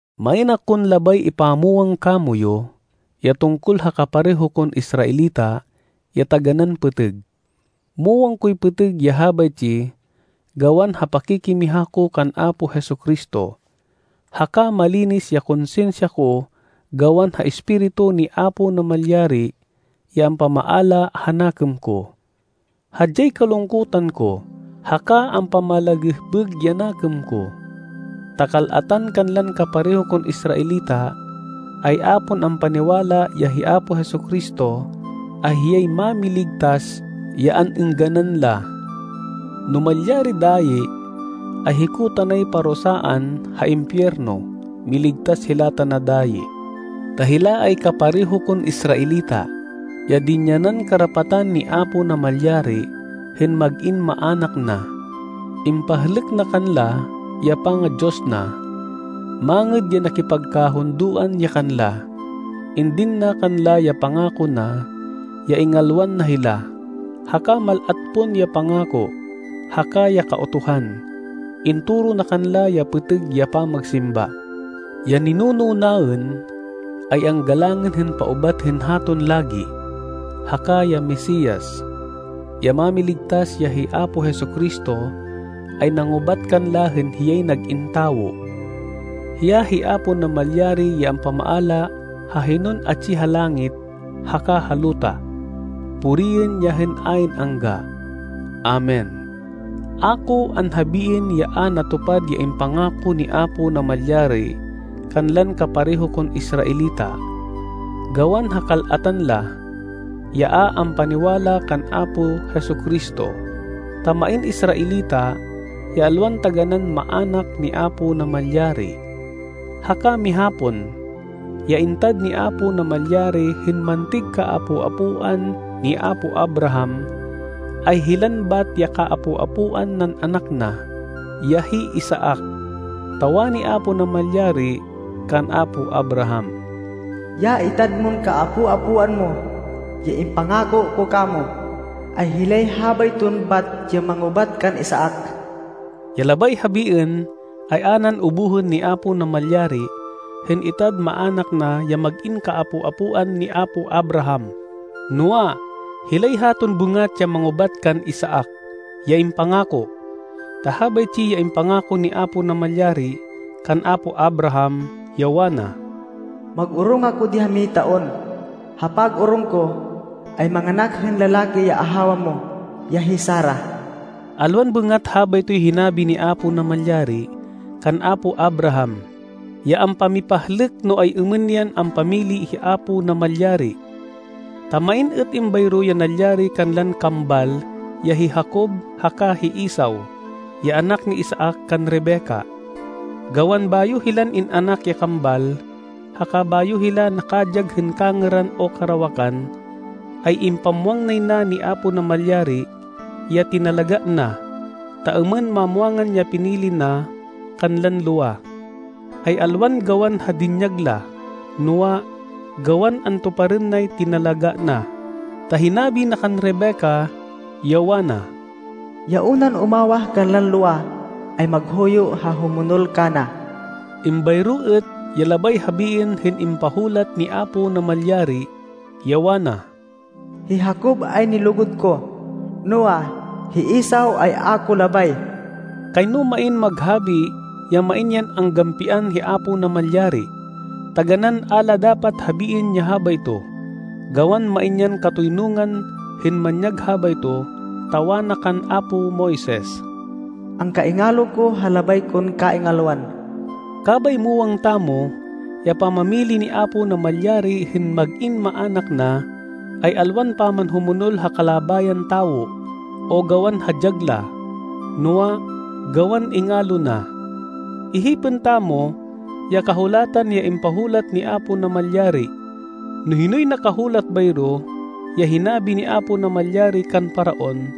Main akon labay ipamwang kamoyu ya tungkol ha kapareho kon Israelita ya taganán pêtêg. Muwang koy pêtêg ya habaytsi gawan ha pakikimiha ko kan Apo Jesu-Cristo, haka malinis ya konsinsya ko gawan ha Espiritu ni Apo Namalyari ya ampamaala ha nakêm ko. Hadyay kalungkutan ko haka ampamalagêhbêg ya nakêm ko, ta kal-atan kanlan kapareho kon Israelita ay a pon ampaniwala ya hi Apo Jesu-Cristo ay hiyay Mámiligtas ya an-êngganan la. No malyari dayi, ay hiko tanay parusaan ha impiyerno miligtas hila tana dayi. Ta hila ay kapareho kon Israelita, ya dinyanan karapatan ni Apo Namalyari hên mag-in maának na. Impahlêk na kanla ya panga-Diyos na. Mangêd ya nakipagkahundoan ya kanla. Indin na kanla ya pangako na ya ingalwan na hila, haka mal-at pon ya pangako, haka ya Kautuhan. Intoro na kanla ya pêtêg ya pamagsimba. Ya ninuno naên ay anggalangên hên paubat hên haton lagi, haka ya Mesias, ya Mámiligtas ya hi Apo Jesu-Cristo ay nangubat kanla hên hiyay nag-in tawo. Hiya hi Apo Namalyari ya ampamaala ha hinon atsi ha langit haka ha luta. Puriên ya hên ayn-angga. Amen. A ko anhabiên ya a natupad ya impangako ni Apo Namalyari kanlan kapareho kon Israelita gawan ha kal-atan la, ya a ampaniwala kan Apo Jesu-Cristo, ta main Israelita ya alwan taganán maának ni Apo Namalyari. Haka miha pon, ya intad ni Apo Namalyari hên mantêg kaapo-apoan ni apo Abraham ay hilan bat ya kaapo-apoan nan anak na, ya hi Isaac, ta wani Apo Namalyari kan apo Abraham, “Ya itad mon kaapo-apoan mo, ya impangako ko kamo, ay hilay habayton bat ya mangubat kan Isaac.” Ya labay habiên, ay a nan ubuhên ni Apo Namalyari hên itad maának na ya mag-in kaapo-apoan ni apo Abraham, noa, hilay haton bêngat ya mangubat kan Isaac, ya impangako. Ta habaytsi ya impangako ni Apo Namalyari kan apo Abraham, ya wana, “Mag-orong ako di ha mihay taon. Ha pag-orong ko ay manganak hên lalaki ya ahawa mo, ya hi Sara.” Alwan bêngat habaytoy hinabi ni Apo Namalyari kan apo Abraham, ya ampamipahlêk no ay-êmên yan ampamili hi Apo Namalyari. Ta main êt êmbayro ya nalyari kanlan kambal ya hi Jacob haka hi Esau, ya anak ni Isaac kan Rebecca. Gawan bayo hilan in-anak ya kambal haka bayo hila nakadyag hên kangêran o karawakan, ay impamwang nay na ni Apo Namalyari ya tinalagá na, ta êmên mamwangan ya pinili na kanlan lowa, ay alwan gawan ha dinyag la, noa, gawan antuparên nay tinalagá na, ta hinabi na kan Rebecca, ya wana, “Ya unan umawah kanlan lowa ay maghuyo ha humonol kana.” Êmbayro êt ya labay habiên hên impahulat ni Apo Namalyari, ya wana, “Hi Jacob ay nilugud ko, noa, hi Esau ay a ko labay.” Kayno main maghabi ya main yan anggampian hi Apo Namalyari. Taganán a la dapat habiên ya habayto! Gawan main yan katoynungan hên manyag habayto, ta wana kan apo Moises, “Angkaingalo ko ha labay kon kaingalwan.” Kabay muwang tamo ya pamamili ni Apo Namalyari hên mag-in maának na, ay alwan pamanhumonol ha kalabayan tawo, o gawan ha dyag la, noa, gawan ingalo na. Ihipên tamo ya Kahulatan ya impahulat ni Apo Namalyari, no hinoy nakahulat bayro ya hinabi ni Apo Namalyari kan Faraon,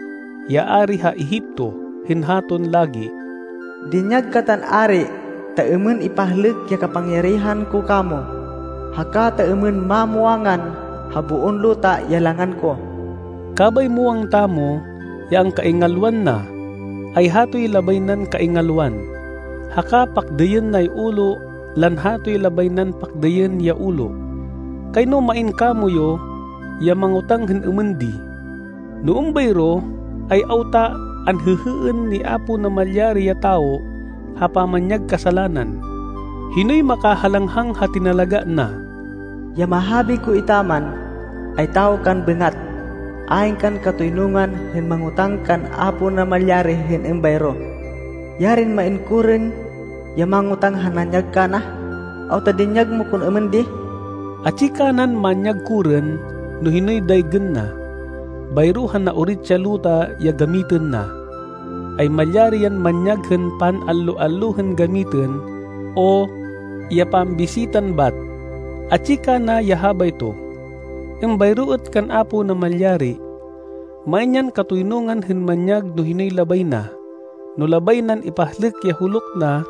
ya ari ha Egipto hên haton lagi, “Dinyag katan ari ta êmên ipahlêk ya kapangyarihan ko kamo, haka ta êmên mamwangan ha boon luta ya langan ko.” Kabay muwang tamo ya angkaingalwan na, ay hatoy labay nan kaingalwan. Haka pakdêyên nay ulo lan hatoy labay nan pakdêyên ya ulo. Kayno main kamoyu ya mangotáng hên êmên di, “No êmbayro, ay awta anhêhêên ni Apo Namalyari ya tawo ha pamanyag kasalanan? Hinoy makahalanghang ha tinalagá na?” Ya mahabi ko etaman, ay tawo kan bêngat. Ayn kan katoynungan hên mangotáng kan Apo Namalyari hên êmbayro. Yarin main korên ya mangotáng ha nanyag kana, “Awta dinyag mo kon êmên di?” Atsi kanan manyag korên no hinoy daygên na. Bayro ha naorit ya luta ya gamitên na, ay malyari yan manyag hên pan-allo-allo hên gamitên o ya pambisitan bat, atsi kana ya habayto. Êmbayro êt kan Apo Namalyari. Main yan katoynungan hên manyag no hinoy labay na. No labay nan ipahlêk ya huluk na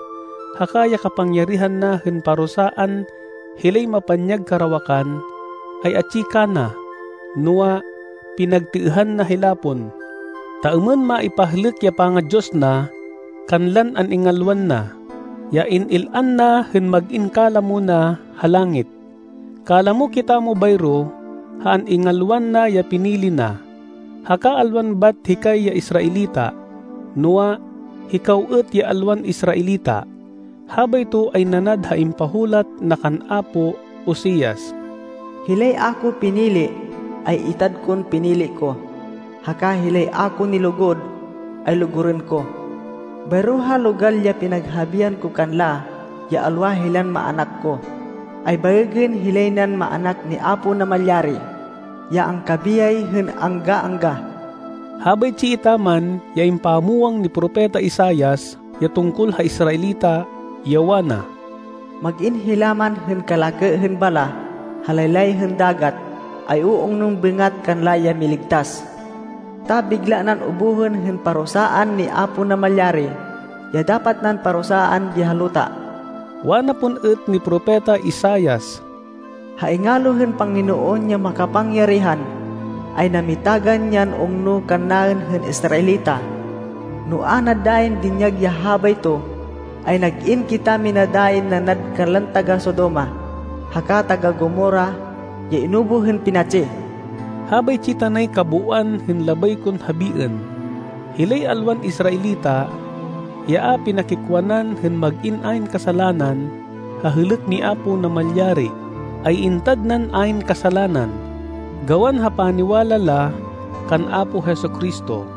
haka ya kapangyarihan na hên parusaan hilay mapanyag karawakan, ay atsi kana. Noa, pinagtêêhan na hila pon, ta êmên maipahlêk ya panga-Diyos na kanlan an-ingalwan na, ya in-il-an na hên mag-in kalamo na ha langit. Kalamo kitamo bayro ha an-ingalwan na ya pinili na, haka alwan bat hikay ya Israelita, noa, hikaw êt ya alwan Israelita. Habayto ay nanad ha impahulat na kan apo Oseas, “Hilay a ko pinili, ay itad kon pinili ko, haka hilay a ko nilugud, ay lugurên ko. Bayro ha logal ya pinaghabian ko kanla ya alwa hilan maának ko, ay baêgên hilay nan maának ni Apo Namalyari, ya angkabiyay hên angga-angga.” Habaytsi etaman ya impamwang ni Propeta Isaias ya tungkol ha Israelita, ya wana, “Mag-in hila man hên kalakê hên balah ha laylay hên dagat, ay u-ungnon bêngat kanla ya miligtas. Ta bigla nan ubuhên hên parusaan ni Apo Namalyari ya dapat nan parusaan di ha luta.” Wana pon êt ni Propeta Isaias, “Ha ingalo hên Panginoon ya makapangyarihan, ay namitagan yan ungno kannaên hên Israelita. No a na dayin dinyag ya habayto, ay nag-in kitamina dayin nanad kanlan taga-Sodoma, haka taga-Gomorra ya inubuh hên pinatsi.” Habaytsi tanay kabooan hên labay kon habiên. Hilay alwan Israelita, ya a pinakikwanan hên mag-in ayn kasalanan ha hêlêk ni Apo Namalyari, ay intad nan ayn kasalanan, gawan ha paniwala la kan Apo Jesu-Cristo.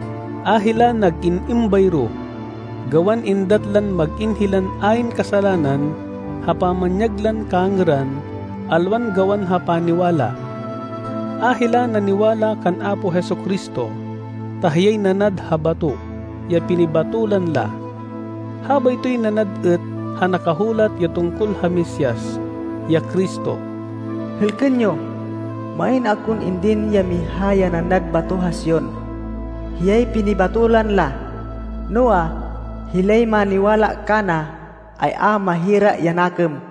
A hila nag-in êmbayro, gawan êndat lan mag-in hilan ayn kasalanan ha pamanyag lan kangêran alwan gawan ha paniwala. A hila naniwala kan Apo Jesu-Cristo, ta hiyay nanad ha bato ya pinibátolan la. Habaytoy nanad êt ha nakahulat ya tungkol ha Mesias, ya Cristo, “Hêlkên yo! Main akon indin ya miha ya nanad bato ha Sion. Hiyay pinibátolan la. Noa, hilay maniwala kana ay a mahira ya nakêm.”